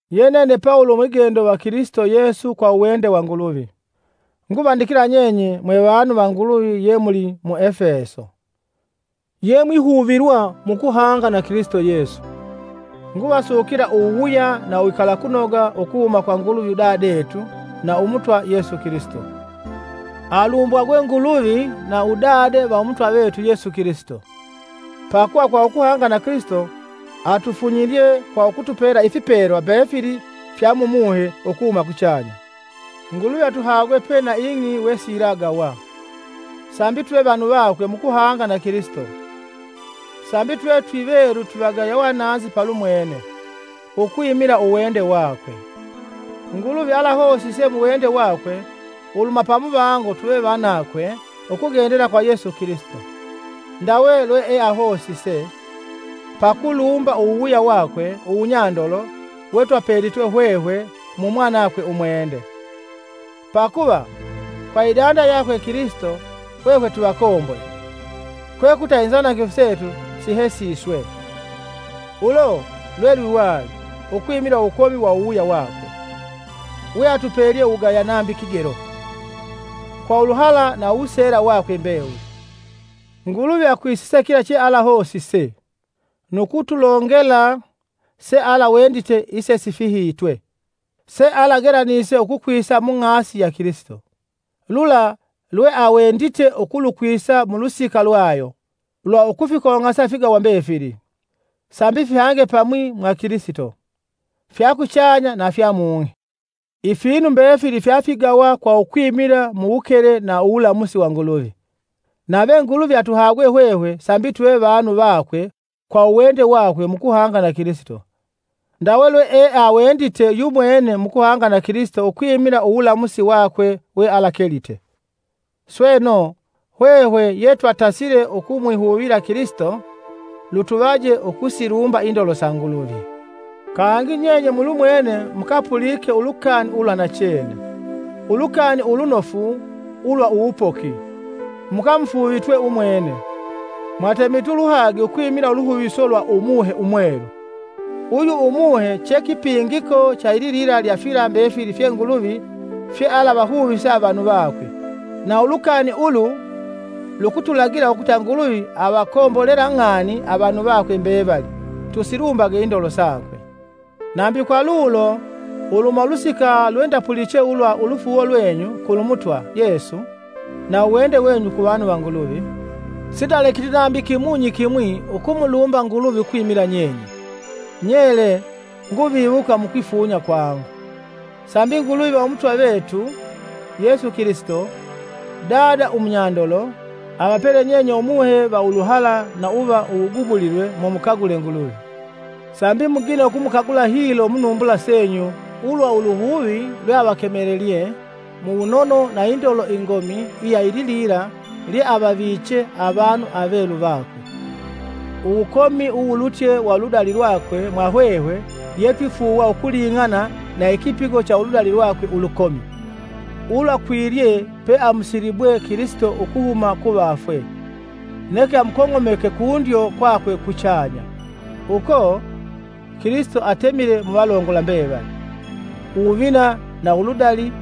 Ye nene Pawulo umwigendo va Kilisito Yesu kwa uwende wa Nguluvi, nguvandikila nyenye mwevanu va Nguluvi ye muli mu Efeso ye yemwihuvilwa mukuhanga na Kilisito Yesu. Nguvasukila uwuwuya na uwikalakunoga ukuhuma kwa Nguluvi Udadetu na Umutwa Yesu Kilisito. Alumbwagwe Nguluvi na Udade va Umutwa vetu Yesu Kilisito! Pakuva, kwa ukuhanga na Kilisito atufunyilye kwa ukutupela ifipelwa mbefili fya Mumuhe ukuhuma kuchanya. Nguluvi atuhagwe pe na ing'i wesiyilagawa, sambi tuve vanu vakwe mukuhanga na Kilisito, sambi tuve twivelu twivagaya uwananzi palumwene, ukwimila uwende wakwe. Nguluvi alahosise muwende wakwe uluhuma pamuvango tuve vanakwe ukugendela kwa Yesu Kilisito. Ndawe lweeahosise pakulumba uwuwuya wakwe uwunyandolo wetwapelitwe hwehwe Mumwanakwe Umwende! Pakuva kwa idanda yakwe Kilisito hwehwe twivakombole, kwekuta inzanangifu setu sihesiswe. Ulo lwelwiwali ukwimila uwukomi wa uwuwuya wakwe, weatupelye uwugaya nambi kigelo! Kwa uluhala na uwuseela wakwe mbewuli. Nguluvi akwisise kila chealahosise, nu kutulongela sealawendite isesifihitwe, sealagelanise ukukwisa mung'asi ya Kilisito. Lula lweawendite ukulukwisa mulusika lwayo, lwa ukufikong'asa ifigawa mbefili, sambi fihange pamwi mwa Kilisito, fya kuchanya na fya mung'i. Ifinu mbefili fyafigawa kwa ukwimila muwukele na uwulamusi wa Nguluvi; nave Nguluvi atuhagwe hwehwe sambi tuve vanu vakwe kwa uwende wakwe mukuhanga na Kilisito, ndawe lweeawendite yumwene mukuhanga na Kilisito ukwimila uwulamusi wakwe wealakelite. Sweno, hwehwe yetwatasile ukumwihuvila Kilisito lutuvaje ukusilumba indolo sa Nguluvi! Kangi nyenye mulumwene mukapulike ulukani ulwa nachene, Ulukani Ulunofu ulwa uwupoki, mukamufuuvitwe umwene, mwatemitwe uluhagi ukwimila uluhuviso lwa Umuhe Umwelu. Uyu Umuhe che kipingiko cha ililila lya fila mbefili fye Nguluvi fyealavahuvise avanu vakwe, na ulukani ulu lukutulagila ukuta Nguluvi avakombolela ng'ani avanu vakwe mbevali. Tusilumbage indolo sakwe! Nambi kwa lulo, uluhuma ulusika lwe ndapuliche ulwa ulufuuwo lwenyu kulumutwa Yesu, na uwende wenyu ku vanu va Nguluvi, Sindalekiti nambi kimunyi kimwi na ukumulumba Nguluvi ukwimila nyenye. Nyele nguviwuka mukwifunya kwangu, Sambi Nguluvi va Umutwa vetu Yesu Kilisito, Dada umunyandolo, avapele nyenye Umuhe va uluhala na uva uwugubulilwe mumukagula Nguluvi, sambi mugine ukumukagula hilo munumbula senyu ulwa uluhuvi lweavakemelelye mu wunono na indolo ingomi iya ililila lyeavaviche avanu avelu vakwe, uwukomi uwulutye wa uludali lwakwe mwahwehwe yetwifuuwa ukuling'ana na ikipigo cha uludali lwakwe ulukomi, ulwakwilye pe amusilibwe Kilisito ukuhuma kuvafwe, neke amukong'omeke kundyo kwakwe kuchanya. Uko, Kilisito atemile muvalongola mbevali, uwuvina na uludali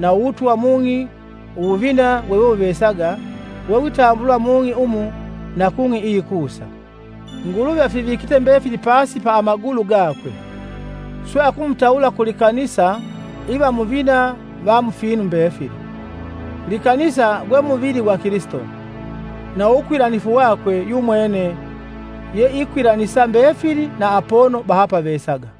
na uwutwa mung'i uwuvina wewewuvesaga wewitambulwa mung'i umu na kung'i iyikusa. Nguluvi afivikite mbefili pasi pa amagulu gakwe, swe akumutawula ku likanisa iva muvina va mufinu mbefili. Likanisa gwe muvili gwa Kilisito, na uwukwilanifu wakwe yumwene yeikwilanisa mbefili na apono bahapavesaga.